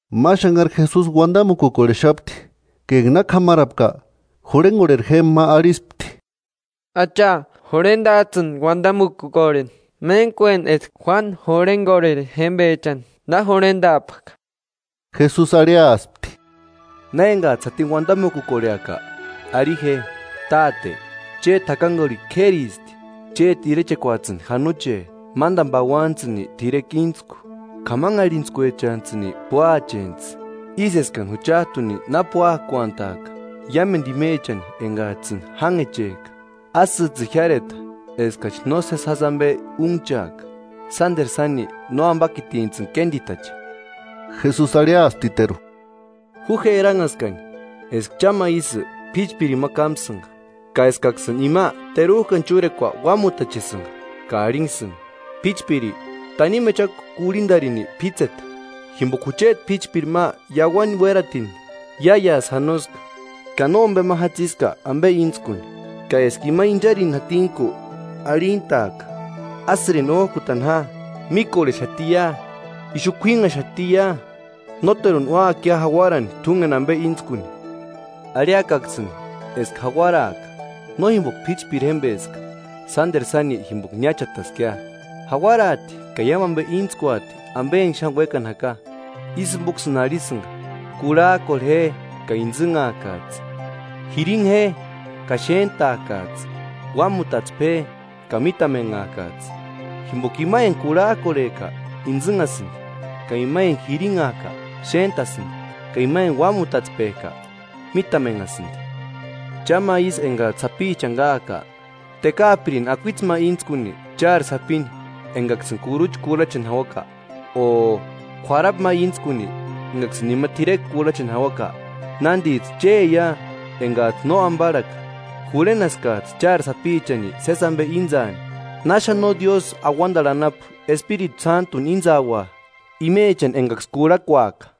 Ma xanhari Jesusi uandamukukorhexapti; ka enga na k'amarapka, jurhengorheri jémba ma arhispti: –Acha, jurhendajtsïni uandamukukorheni, méntkueni eska Juánu jurhengorheri jémbechani na jurhendaapka. Jesusi arhiaspti: –Na engajtsï jatini uandamukukorheaka, arhi je: Táte, chéti jakangurhikua k'éristi. Chéti irechekuajtsïni janoche. Mándani pauanijtsïni t'irekua íntsku. K'amanharhintskuechantsïni púacheantsï, ísï eskani juchajtuni na púakuantajka iámendu imechani engajtsïni jánhechejka. Ásïjtsïni jiáreta eskachi nósesi jásï ambe únhchaaka, [sánderu sáni, nóambakitintsïni kénditache.] Jesusi arhiasptiteru: –Ju je eranhaskani eska cha ma ísï p'íchpirini ma kámsïnga, ka eskaksïni ima terujkani chúrekua uámutachesïnga ka arhinksïni: P'íchpiri, tanimu echakua kurhindarini p'ítseta, jimboka jucheti p'íchpiri ma iauani uératini iáiasï janoska, ka nómbema jatsiska ambe íntskuni. Ka eska ima incharini jatinku arhintaaka: Ásïrini ójkutani ja; míkorhexatia, ixu k'uínnhaxatia. Nóteruni úakia jauarani t'úngeni ambe íntskuni. Arhiakaksïni eska jauaraaka, no jimboka p'íchpiri jémbeska, sánderu sáni jimboka niáchataskia, jauaraati ka iámu ambe íntskuati ambe enga xáni uékani jaka. Ísï jimboksïni arhisïnga: Kurhajkorhe je, ka intsïnhakajtsï; jirinha je, ka xéntaakajtsï, uámutatspe je, ka mítamenhaakajtsï. Jimboka ima enga kurhajkorhejka, intsïnhasïndi; ka ima enga jirinhajka, xéntasïndi; ka ima enga uámutatspejka, mítamenhasïndi. “Cha ma ísï engajtsï sapichani káajka, ¿Tekaapirini akuitse ma íntskuni chári sapini engaksïni kurucha kurhacheni jauaka? O ¿K'uarapu ma íntskuni ekaksïni ima t'irekua kurhacheni jauaka? Nándijtsï chéia engajtsï no ambarhaka, jurhenaskajtsï chári sapichani sési ambe íntsaani, ¡Na xáni no Diósï auandarhu anapu Espiritu Sántuni íntsaua imechani engaksï kurhakuaka!”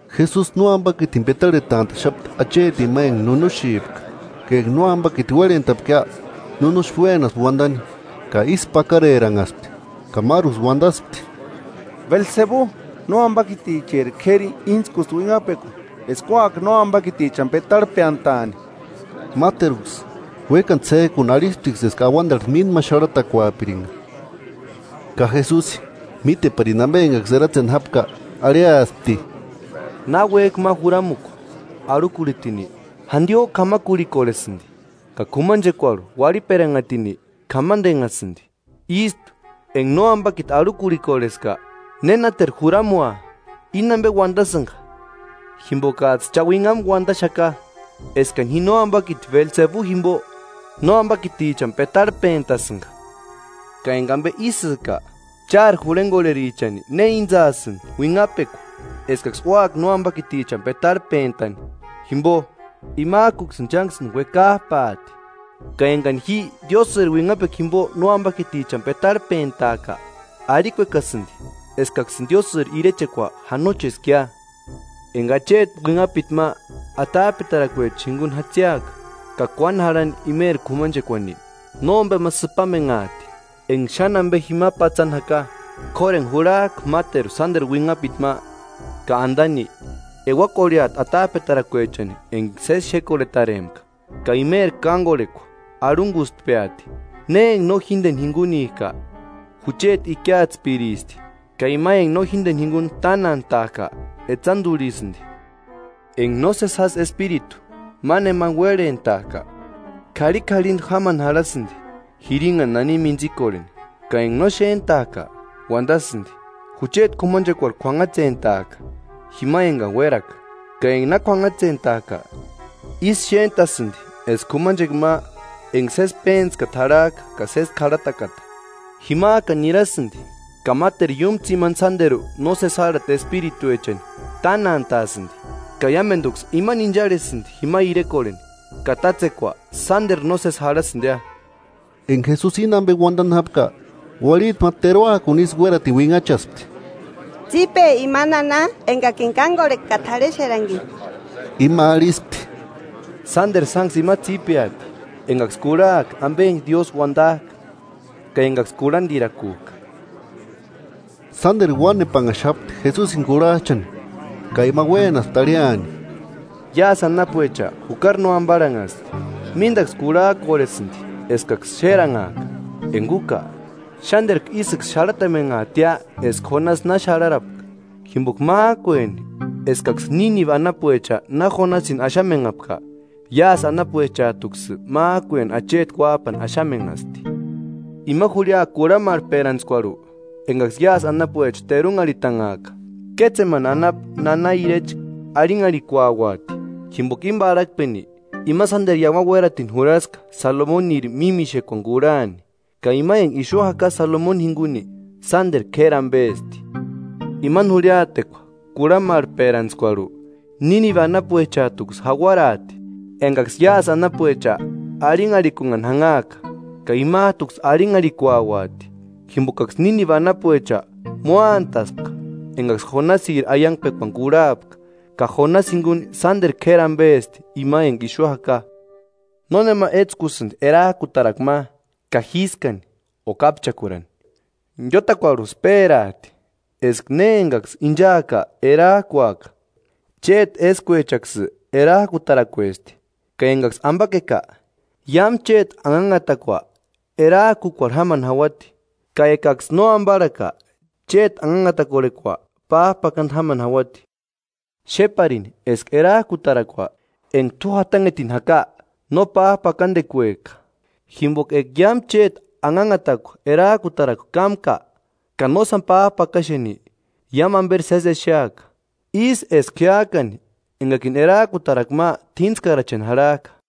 Jesusi nóambakitini petarhetantaxapti achetini ma enga nunuxipka; ka enga na nóambakiti uérhentapkia, nunuxi uénaspti uandani. Ka ísku pakareranhaspti, ka máruksï uandaspti: “Belsebu, nóambakiticheri k'éri íntskusti uinhapekua eska úaka nóambakitichani petarhpeantani.” Máteruksï, uékani ts'éjkuni arhisptiksï eska auandarhu mínda ma xarhatakuapiringa. Ka Jesusi, míteparini ambe engaksï eratseni jápka, arhiaspti: “Náki uéjki ma juramukua arhukurhitini, jandiojku k'amakurhikorhesïndi, ka k'umanchekuarhu uarhiperanhatini k'amandenhasïndi. Ístu, enga Nóambakiti arhukurhikorheska, ¿Nénateru juramua? Íni ambe uandasïnga jimbokajtsï cha uinhamu uandaxaka eskani ji nóambakiti Belsebu jimbo nóambakitichani petarhpentasïnga; ka enga ambe ísïka, ¿Chári jurhengorherichani ne íntsasïni uinhapekua eskaksï úaka nóambakitichani petarhpentani? Jimbo, imajkuksïni chánksïni uekajpaati. Ka engani ji Diósïri uinhapekua jimbo nóambakitichani petarhpentajka, arhikuekasïndi eskaksïni Diósïri irechekua janocheskia.” “Enga acheti uinhapiti ma atajpetarakuechani jingunku jatsiaka ka kuáni jarhani imeri k'umanchekuani, nómbema sïpamenhaati enga xáni ambe jima patsani jaka. K'óru enga jurhajka máteru sánderu uinhapiti ma ka andani, euakorheati atajpetarakuechani enga sési xékorhetarempka, ka imeri kángorhekua arhungustpeati.” “Ne enga no jíndeni jingunika, jucheti ikiatspiristi, ka ima enga no jíndeni jinguni tánantajka etsandurhisïndi.” “Enga nósesi jásï espiritu ma nemani uérhentajka, k'arhik'arhindu jámani jarhasïndi jirinhani nani mintsikorheni; ka enga no xéntajka, uandasïndi: Jucheti k'umanchekuarhu k'uanhatsentaaka, jima engani uéraka. Ka enga na k'uanhatsentajka, ísï xéntasïndi eska k'umanchekua ma enga sési péntskata jarhajka ka sési k'arhatakata. Jimajkani nirasïndi ka máteru iúmu tsimani sánderu nósesi járhatichani espirituechani tánantaasïndi, ka iámenduksï imani incharhesïndi jima irekorheni, ka tátsekua sánderu nósesi jarhasïndia.” Enga Jesusi íni ambe uandani jápka, uarhiti ma teruakuni ísï uératini uinhachaspti: –¡Tsípe ima nana engakini kángorheka ka t'arhexerankini! Ima arhispti: –¡Sánderu sánksï imasï tsípeati engaksï kurhajka ambe enga Diósï uandajka, ka engaksï kurhandirakujka! Sánderu uánepanhaxapti Jesusini kurhajchani, ka ima uénaspti arhiani: “Iásï anapuecha jukari no ambarhanhasti; míndaksï kurhajkorhesïndi eskaksï xéranhaaka, enga úka, xánderku ísïksï xarhatamenhaatia eska Jonasi na xarharapka. Jimboka májkueni eskaksï Nínibe anapuecha na Jonasini axamenhapka, iásï anapuechajtuksï májkueni acheti Uájpani axamenhasti. Ima jurhia kurhamarhperantskuarhu, engaksï iásï anapuecha terunharhitanhaaka, kétsemani anapu nana irecha arhinharhikuauati; jimboka íni parhakpeni ima sánderu iauani uératini jurhaska Salomoniri mímixekuani kurhani, ka ima enga ixu jaka Salomoni jinguni sánderu k'éri ambesti. Imani jurhiatekua kurhamarhperantskuarhu Nínibe anapuechajtuksï jauaraati, engaksï iásï anapuecha arhinharhikunhani janhaaka, ka imajtuksï arhinharhikuauati; jimbokaksï Nínibe anapuecha móantaspka engaksï Jonasiri aiangpekuani kurhapka, ka Jonasi jinguni sánderu k'éri ambesti ima enga ixu jaka.” “Nónema étskusïndi erajkutarakua ma ka jískani o kápchakurani, iótakuarhusï pérajti, eska ne engaksï inchaaka erajkuaka. Chéti éskuechaksï erajkutarakuesti; ka engaksï ambakeka, iámu chéti anhanhatakua erajkukuarhu jámani jauati; ka ekaksï nóambarhaka, chéti anhanhatakorhekua pájpakandu jámani jauati. Xéparini eska erajkutarakua enga t'u jatanhetini jaka no pájpakandekueka. Jimboka eka iámu chéti anhanhatakua erajkutarakua kámka ka nósani pájpakaxeni, iámu amberi sési exeaka, ísï eska jiájkani engakini erajkutarakua ma t'íntskaracheni jarhajka.”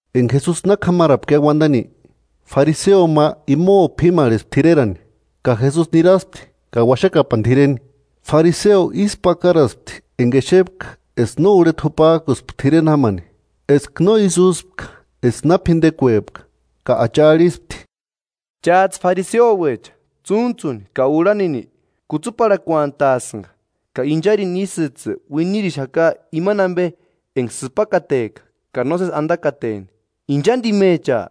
Enga Jesusi k'amarapkia uandani, fariseo ma imo p'imarhespti t'irerani, ka Jesusi niraspti ka uaxakapani t'ireni. Fariseo ísku pakaraspti enga exepka eska no urheta jupajkuspka t'ireni jámani, eska no ísï úspka eska na p'indekuepka. Ka Acha arhispti: –Chájtsï fariseouecha tsúntsuni ka urhanini kutsuparhakuantasïnga, ka incharini ísïjtsï uinirixaka imani ambe enga sïpakateka ka nósesi andakateni. ¡Inchandimecha!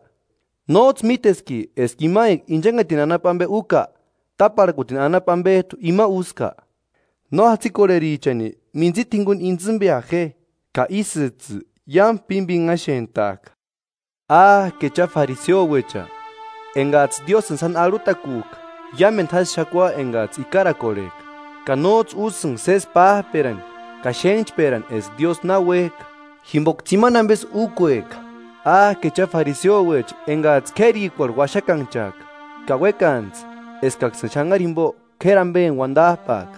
¿Nójtsï míteski eska ima enga inchanhetini anapu ambe úka, táparhakuni anapu ambejtu ima úska? No jatsikorherichani mintsita jinguni intsïmbea je, ka ísïjtsï iámu pímpinhaxentaaka. “¡Áke cha, fariseouecha! Engajtsï Diósïni sáni arhutakujka iámendu jásï xakua engajtsï ikarakorhejka, ka nójtsï úsïnga sési pájperani ka xénhchperani eska Diósï na uéjka. Jimboka tsimani ambesï úkueka.” “Áke cha fariseouecha engajtsï k'érikuarhu uaxakanhchajka ka uékantsï eskaksïni xanhari jimbo k'éri ambeni uandajpaaka.”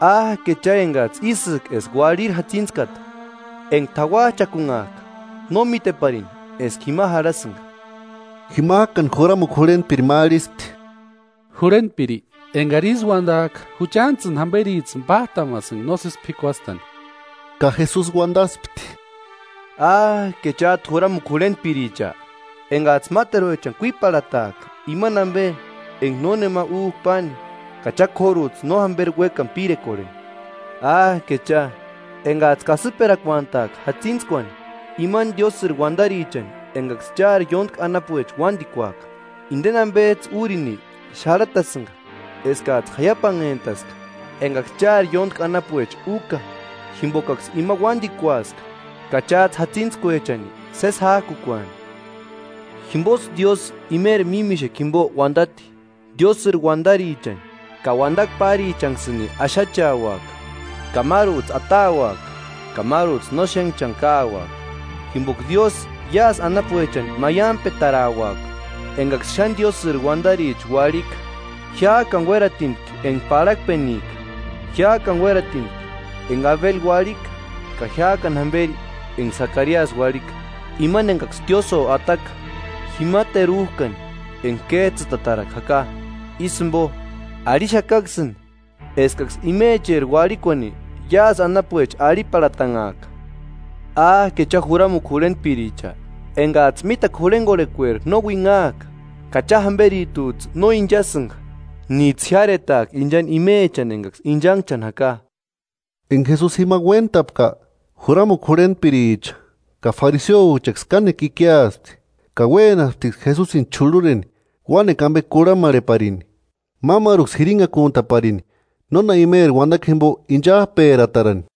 “¡Áke cha, engajtsï ísïka eska uarhiri jatsintskata! Enga t'auajchakunhajka no míteparini eska jima jarhasïnga.” Jimajkani juramukua jurhentpiri ma arhispti: –Jurhentpiri, engari ísï uandajka juchantsïni jamberijtsïni pájtamasïnga nósesi p'ikuastani. Ka Jesusi uandaspti: –¡Áke chájtu juramukua jurhentpiricha! Engajtsï máteruechani kuiparhataajka imani ambe enga nónema újka páni, ka cha k'órujtsï no jamberi uékani pirekorheni. “¡Áke cha! Engajtsï kasïperakuantaajka jatsintskuani imani Diósïri uandarichani engaksï chári ióntki anapuecha uándikuaka. Indeni ambejtsï úrini xarhatasïnga eskajtsï jaiapanhentaska engaksï chári ióntki anapuecha úka, jimbokaksï ima uándikuaska ka chájtsï jatsintskuechani sési jájkukuani.” “Jimbosï Diósï imeri mímixekua jimbo uandati: ‘Diósïri uandarichani ka uandakua párichanksïni axacheaxaka, ka márujtsï atauaka ka márujtsï no xénhchani káuaka’ Jimboka Diósï iásï anapuechani maiampetarauaka engaksï xáni Diósïri uandaricha uarhika, jiájkani uératintki enga parhakpenika. Jiájkani uératintki enga Abeli uarhika ka jiájkani jamberi enga Sakariasï uarhika, imani engaksï tiósïo ataka jima terujkani enga kéjtsïtatarakua jaka. Ísï jimbo, arhixakaksïni eskaksï imecheri uarhikuani iásï anapuecha arhiparhatanhaaka.” “¡Áke cha, juramukua jurhentpiricha! Engajtsï mítakua jurhengorhekueri no uinhajka; ka cha jamberijtujtsï no inchasïnga níjtsï jiáretaajki inchani imechani engaksï inchanhchani jaka.” Enga Jesusi jima uéntapka, juramukua jurhentpiricha ka fariseouechaksï kánekua ikiaspti, ka uénasptiksï Jesusini ch'urhureni uánekua ambe kurhamarheparini, mámaruksï jirinhakuntaparini nóna imeri uandakua jimbo inchajperatarani.